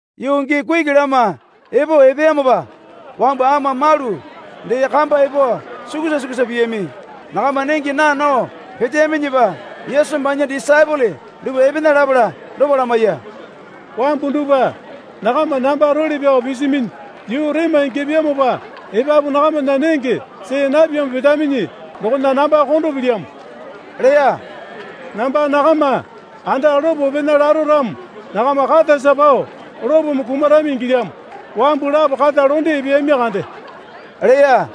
Yuu gii kuki lama epo epeyamopa wambu ama malu dee kamba epo sukusa sukusa piyami. Nakama nenge naa nao peteyaminyipa Yesu banya disaepole dupwa epena lapala dopa lamaiya. Wambu dupwa nakama namba role pyao pisiminyi yuu rema ingyapyamopa epapu nakamana nenge see napyamo petaminyi dokona namba kondo pilyamo, leya. Namba nakama anda lopo pena laro ramo nakama katasa pao lopome kumarami ingilyamo. Wambu lapo kata londe epeyami kande, leya.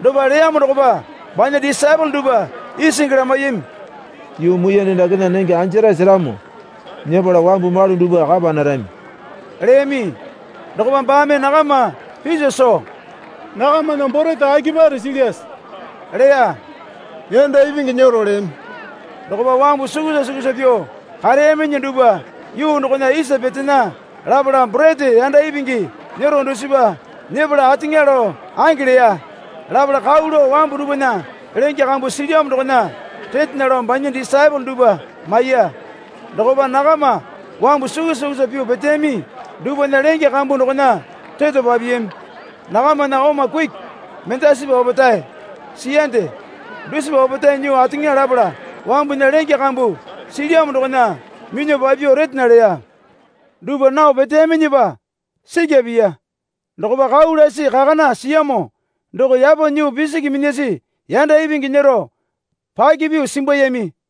Dopa leyamo dokopa banya disaepole dupwa isingi lamaiyami. Yuu muiyane dakena nenge anjarae seramo nyepala wambu malu dupwa kapa narami? leyami. Dokopa baame nakama piso soo, Nakamana borete akipare silyase? leya. Yanda ipingi nyero leyami. Dokopa wambu sukusa sukusa pyuo kareyaminyi dupwa yuu dokona isa petena. Lapala borete yanda ipingi nyero dusipa nyepala ateŋa lao ange leya. Lapala kau lao wambu dupwana lenge kambu silyamo dokona retena lao banya disaepole dupwa maiya. Dokopa nakama wambu sukusa sukusa pyuo peteyami dupwana lenge kambu dokona reto papiyami. Nakamana oma kuki mendasipa opetae siyande. Dusipa opetae nyuo ateŋa lapala wambunya lenge kambu silyamo dokona minyuo papyuo retena leya. Dupwa nao peteyaminyipa sikya piya. Dokopa kau lasi kakana siyamo doko yapo nyuo pisiki minyasi yanda ipingi nyero paka pyuo simbuyami.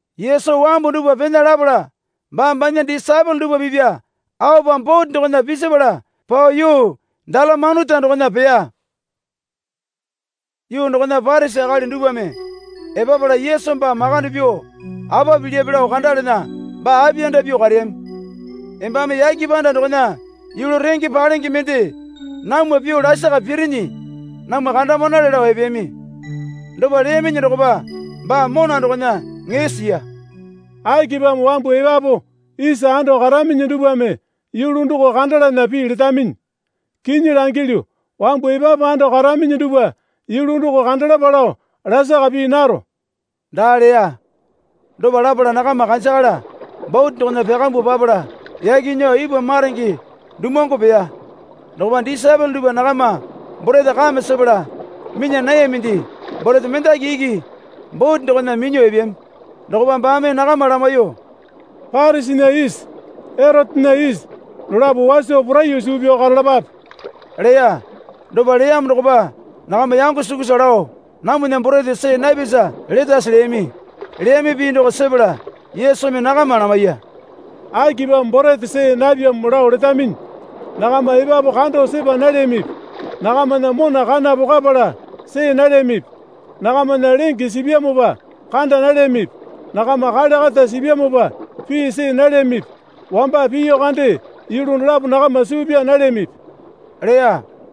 Yesu wambu dupwa pena lapala baa banya disaepole dupwa pipya aopa bote dokona pisipala pao yuu Dalamanuta dokona peya. Yuu dokona Parisi akali dupwame epapala Yesu baa makande pyuo apa pilyape lao kandalana baa apiyanda pyuo kareyami. Embame yake panda dokona yulu renge palenge mende namwa pyuo lasaka pirinyi namwa kandamanale, lao epeyami. Dopa leyaminyi dokopa baa mona dokona ŋee siya. Akipamo wambu epapu isa ando karaminyi dupwame yulu doko kandalana pii letaminyi? Kinyi langilyu, wambu epapu ando karaminyi dupwa yulu doko kandalapa lao lakara pii naro, daa leya. Dopa lapala nakama kanjakala bote dokona pyakambuo papala yaki nyuo ipwa maronge dumuwangu peya. Dokopa disaepole dupwa nakama borete kame sepala minya nayaminde. Borete mendaki iki bote dokona minyuo epeyami. Dokopa baame nakama lamaiyuo, Parisinya isi Erotena isi dolapo waso poraiyuo suu pyao karalapape, leya. Dopa leyamo dokopa nakama yango sukusa lao namwana borete see napyasa letase leyami. Leyami pii doko sepala Yesumi nakama lamaiya. Akipamo borete see napyamo lao letaminyi? Nakama epapu kando sepa nalyamipi? Nakamana mona kana pokwapala see nalyamipi? Nakamana lenge sipyamopa kanda nalyamipi? Nakama kale kata sipyamopa pii see nalyamipi? Wamba piyu kande yulu dolapo nakama suu pyaa nalyamipi? leya.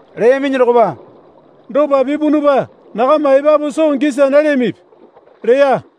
Leyaminyi dokopa, Dopa pipunupa nakama epapu soo gisa nalyamipi? leya.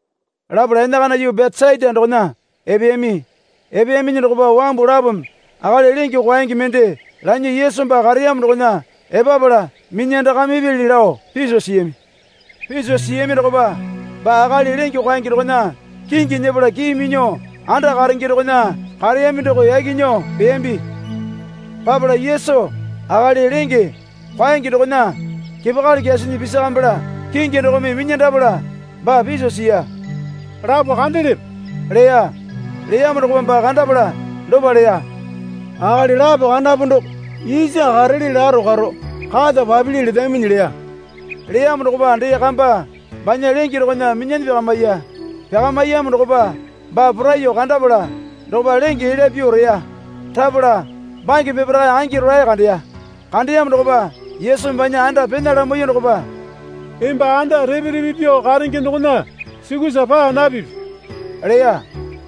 Lapala enakana yuu Betesaita dokona epeyami. Epeyaminyi dokopa wambu lapome akali lenge kwaenge mende lanyuo Yesu baa kareyamo dokona epapala minyandakamipyali lao piso siyami. Piso siyami dokopa baa akali lenge kwaenge dokona kingi nyepala kii minyuo anda karenge dokona kareyami doko yaki nyuo peyambi. Papala Yesu akali lenge kwaenge dokona kepakali kyasinyi pisakamipala kingi dokome minyandapala baa piso siya. Lapo kandelepe? leya. Leyamo dokopa baa kandapala dopa leya. Akali lapo kandapu doko isa karele laro karo kata papili letaminyi leya. Leyamo dokopa dee kamba banya lenge dokona minyanyi pyakamiya. Pyakamiyamo dokopa baa poraiyuo kandapala dokopa lenge elya pyuo reya. Rapala bange peparae angi rolae kandeya. Kandeyamo dokopa Yesumi banya anda pena lamaiyuo dokopa, Emba anda repe repe pyuo karenge dokona sukusa paa napipi, leya.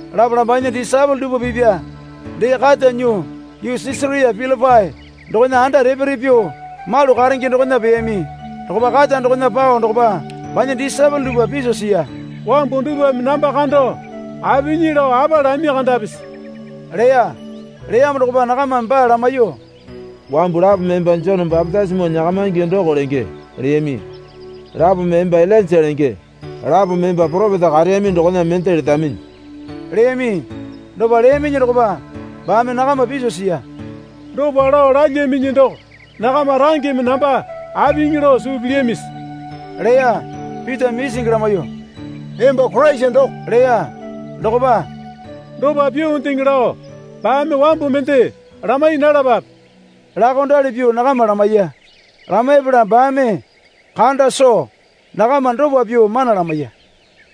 Lapala banya disaepole dupwa pipya dee kata nyuo yuu Sisaria Pilipai dokona anda repe repe pyuo malu karenge dokona peyami. Dokopa kata dokona pao dokopa banya disaepole dupwa piso siya. Wambu dupwame namba kando apinyi lao apa lami kandapisi? leya. Leyamo dokopa nakamame baa lamaiyuo, Wambu lapome emba Jone bapitisimo nyakamaingi doko lenge, leyami, Lapome emba Ilainja lenge, lapome emba poropeta kareyami dokona mende letaminyi, leyami. Dopa leyaminyi dokopa baame nakama piso siya. Dopa lao lalyaminyi doko nakama rangeme namba apinyi lao suu pilyamisi? leya. Pitame isingi lamaiyuo, Emba Koraisa doko, leya. Dokopa, Dopa pyuondeŋe lao baame wambu mende lamai nalapape, laokondali pyuo nakama lamaiya. Lamaipala baame kanda soo nakama dopa pyuo mana lamaiya.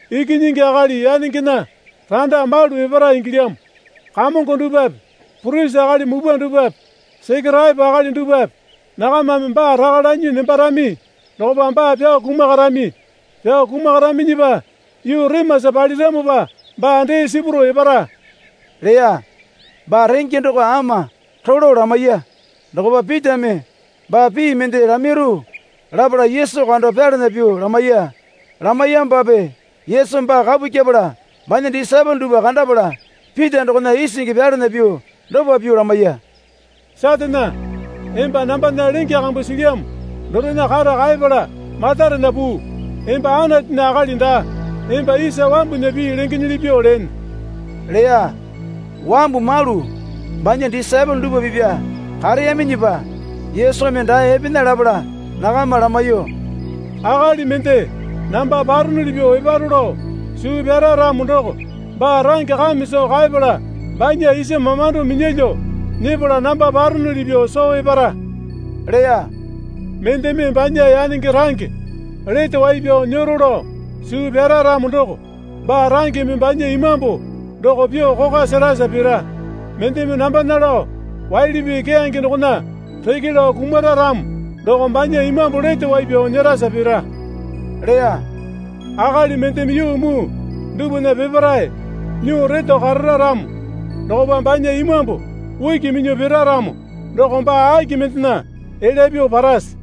Ikinyingi Akali yanengena randa malu epara ingilyamo. Kamongo dupwape purisi akali mupwa dupwape Sekeraepo akali dupwape nakamame baa raka lanyi nembarami. Dokopa baa pyao kumakarami. Pyao kumakaraminyipa yuu remasa paliramopa baa dee sipurao epara, leya. Baa renge doko ama rolo lamaiya. Dokopa Pitame baa pii mende lamairu lapala Yesu kando pyalana pyuo lamaiya. Lamaiyamopape Yesu baa kapu kyepala banya disaepole dupwa kandapala Pita dokona isingi pyalana pyuo dopa pyuo lamaiya. Satane, emba nambana lenge kambu silyamo dorena kata kaepala matarena puu. Emba Anatunya akali daa, emba isa wambunya pii lengenyili pyuo lene, leya. Wambu malu banya disaepole dupwa pipwa kareyaminyipa Yesumi dae epena lapala nakama lamaiyuo, Akali mende namba paronuli pyuo eparo lao suu pyara ramo doko baa range kame soo kaepala banya isa mamando minyalyuo nyepala namba paronuli pyuo soo epara, leya. Mendeme banya yanenge range lete wai pyao nyero lao suu pyara ramo doko baa rangeme banya imambu doko pyuo kokwa serasa pira. Mendeme nambana lao waili pii keyange dokona reke lao kumara ramo doko banya imambu lete wai pyao nyerasa pira, leya. Akali mendeme yuu muu dupwana peparae nyuo reto karara ramo dokopa banya imambu uki minyuo pira ramo doko baa aki mendena elya pyuo parase?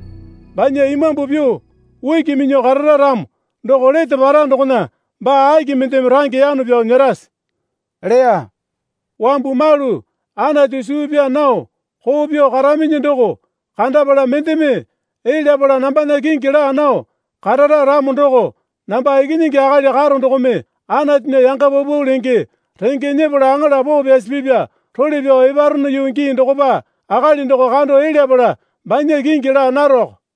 Banya imambu pyuo uki minyuo karara ramo doko lete para dokona baa aki mendeme range yano pyao nyerase? leya. Wambu malu Anatu suu pyaa nao koo pyuo karaminyi doko kandapala mendeme elyapala nambana kingi laa nao karara ramo doko namba Ikinyingi Akali karo dokome Anatunya yanga paupau lenge renge nyepala aŋala poo pyasi pipya role pyao eparono yuu gii dokopa akali doko kando elyapala banya kingi laa naroko.